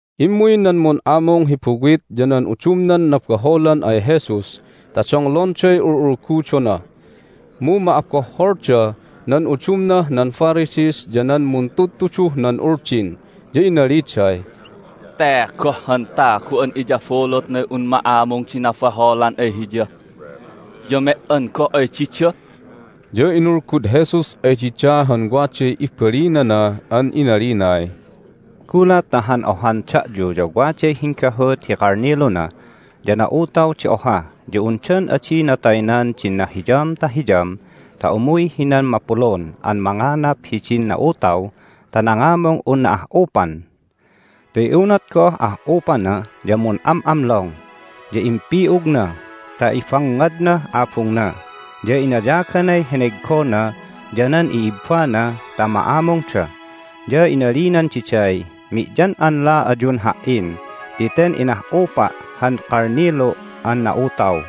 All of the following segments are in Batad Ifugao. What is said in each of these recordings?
Immuy nan mun'amung hi buwit ya nan udumnan nabaholan ay Jesus ta donglonday ul'ulgudona. Mu ma'abohholda nan udumnah nan Pharisees ya nan muntudtuduh nan Uldin, ya inaliday, "Te goh han tagu an iyabulutnay un ma'amung di nabaholan ay Hiya, ya me"an goh ay dida!" Ya inulgud Jesus ay dida han waday ibalinana an inalinay, "Gulat ta han ohan da'yu ya waday hinggahut hi kalniluna, ya na'utaw di oha ya undan adina taynan din nahiyam ta hiyam ta umuy hinan mapulun an manganap hidin na'utaw ta nangamung unna ah'upan? Ti unat goh ah'upana ya mun'am'amlong, ya impi'ugna ta ibangngadnah abungna, ya inayaganay heneggona ya nan i'ibbana ta ma'amungda. Ya inalinan diday, Mi'yan'anla ayun ha"in ti ten inah'upa' han kalnilu' an na'utaw!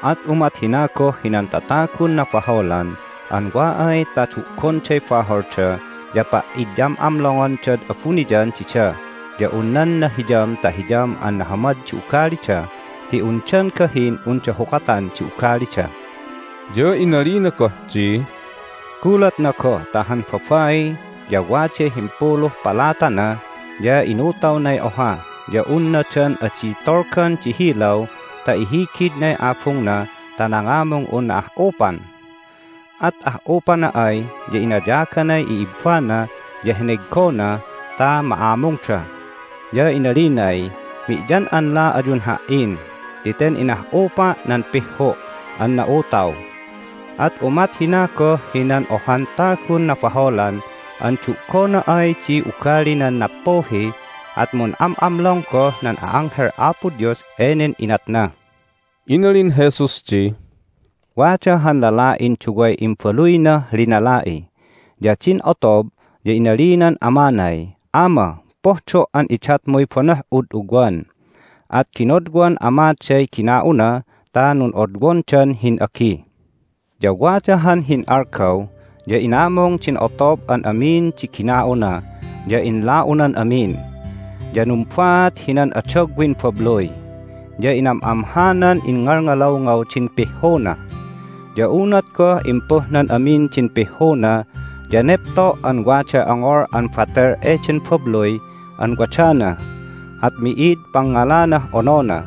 At umat hina goh hinan tatagun nabaholan an wa ay ta du'gonday baholda ya pa'idyam'amlongondad abuniyan dida ya un nan nahiyam ta hiyam an nahamad di ugalida, ti undan gahin unda hukatan di ugalida." Ya inalina goh di, "Gulatna goh ta han babai ya waday himpuluh palatana, ya inutawnay oha ya unna dan adi tolgan di hilaw ta ihigidnay abungna ta nangamung unna ah'upan? At ah'upana ay ya inayaganay i'ibbana ya heneggona ta ma'amungda. Ya inalinay, Mi'yan'anla ayun ha"in ti ten inah'upa' nan pihhu' an na'utaw! At umat hina goh hinan ohan tagun nabaholan an du'gona ay di ugalinan nappuhi at mun'am'amlong goh nan a'anghel Apo Dios enen inatna." Inalin Jesus di, "Wada han lala'in duway imbaluynah linala'i. Ya din otob ya inalinan amanay, Ama, pohdo' an idatmuy banoh'ud ugwan. At ginodwan amaday gina'una ta nun'odwondan hin'agi. Ya wada han hin'algaw ya inamung din otob an amin di gina'una, ya inla'unan amin. Ya numbaat hinan adagwin babluy, ya inam'amhanan ingngalngalawngaw din pihhuna. Ya unat goh impuhnan amin din pihhuna ya nepto' an waday ongol an batel eden babluy an wadana, at mi'id pangngalanah onona.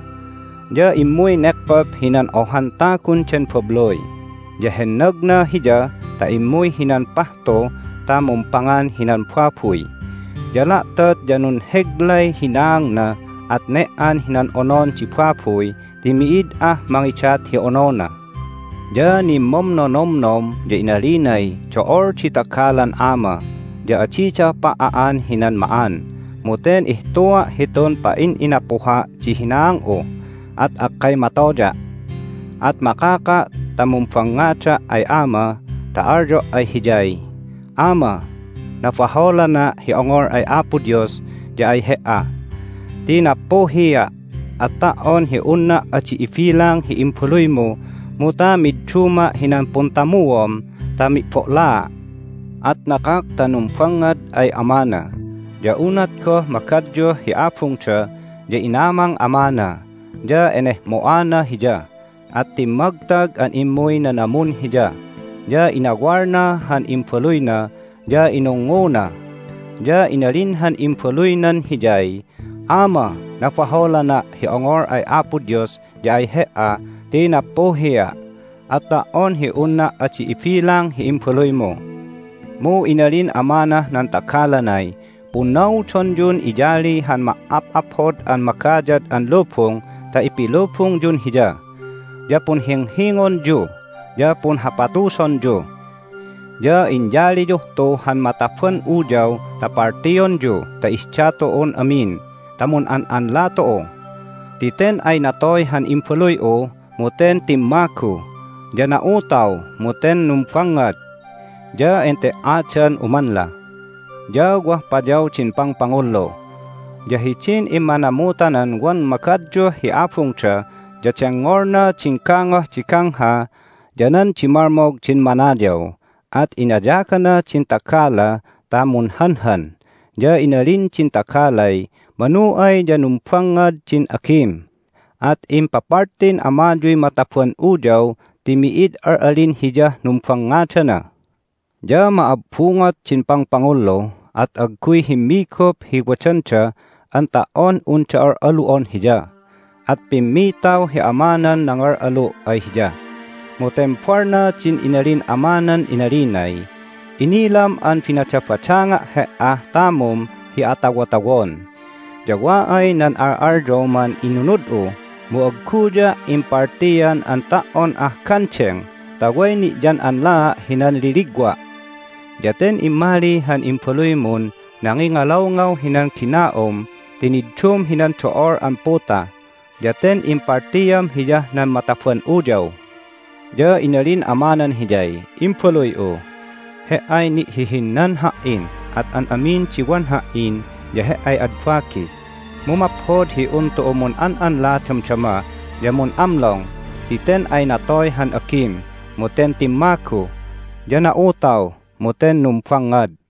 Ya immuy nekkop hinan ohan tagun den babluy, ya hennagna hiya ta immuy hinan pahtu ta mumpangan hinan babuy. Ya la'tot ya nunheglay hinaangna, at ne"an hinan onon di babuy ti mi'id ah mangidat hi onona. Ya nimmomnonomnom, ya inalinay, Do'ol di tagalan ama, ya adida pa"a'an hinan ma'an, mu ten ihtua' hitun pa'in'inapuha' di hinaang'u, at akkay matoya'! At makaka' ta mumbangngada' ay ama ta alyo' ay hiyay, Ama, nabaholana' hi ongol ay Apo Dios ya ay he"a ti nappuhia'! At ta"on hi unna' adi ibilang hi imbaluymu mu ta midduma' hinan puntamuom ta mi'bo'laa'. At nakak ta numbangngad ay amana. Ya unat goh magadyuh hi abungda ya inamang amana, ya enehmo'ana hiya, at timmagtag an immuy nanamun hiya, ya inawalna han imbaluyna, ya inungnguna. Ya inalin han imbaluynan hiyay, Ama, nabaholana' hi ongol ay Apo Dios ya ay he"a ti nappuhia'! At ta"on hi unna' adi ibilang hi imbaluymu. Mu inalin amanah nan tagalanay, Punnaudonyun iyali han ma"ap'aphod an magayad an lubung ta ipilubungyun hiya! Ya punhinghingonyu! Ya punhapatusonyu! Ya inyaliyuh tu han mataban uyaw ta paltionyu ta ihda tu'un amin ta mun'an'anla tu'u! Ti ten ay natoy han imbaluy'u, mu ten timmagu! Ya na'utaw, mu ten numbangngad! Ya ente"adan umanla. Ya wah payaw din pangpangullu. Ya hidin immanamutanan wan magadyuh hi abungda ya dengngolna din gangoh di gangha ya nan dimalmog din manayaw. At inayagana din tagala ta munhanhan, ya inalin din tagalay, Manu ay ya numbangngad din agim, at impapaltin amayuy mataban uyaw ti mi'id al'alin hiyah numbangngadana. Ya ma'abbungot din pangpangullu, at agguy himmigup hi wadanda an ta"on unda al'alu'on hiya. At pimmitaw hi amanan nangal'alu' ay hiya. Mu tembalna din inalin amanan inalinay, Inilam an binadabadanga' he"ah tamum hi atawotawon, ya wa ay nan al'alyoman inunud'u, mu agguya' impaltian an ta"on ah gandeng ta way ni'yan'anlaa' hinan liligwa'! Ya ten immali han imbaluymun nangingalawngaw hinan gina'um ti niddum hinan do'ol an puta, ya ten impaltiam hiyah nan mataban uyaw! Ya inalin amanan hiyay, Imbaluy'u, he"ay ni'hihinnan ha"in, at an amin di wan ha"in ya he"ay ad bagi. Mu maphod hi un tu'u mun'an'anla damdama ya mun'amlong ti ten ay natoy han agim, mu ten timmagu, ya na'utaw, mu ten numbangngad!"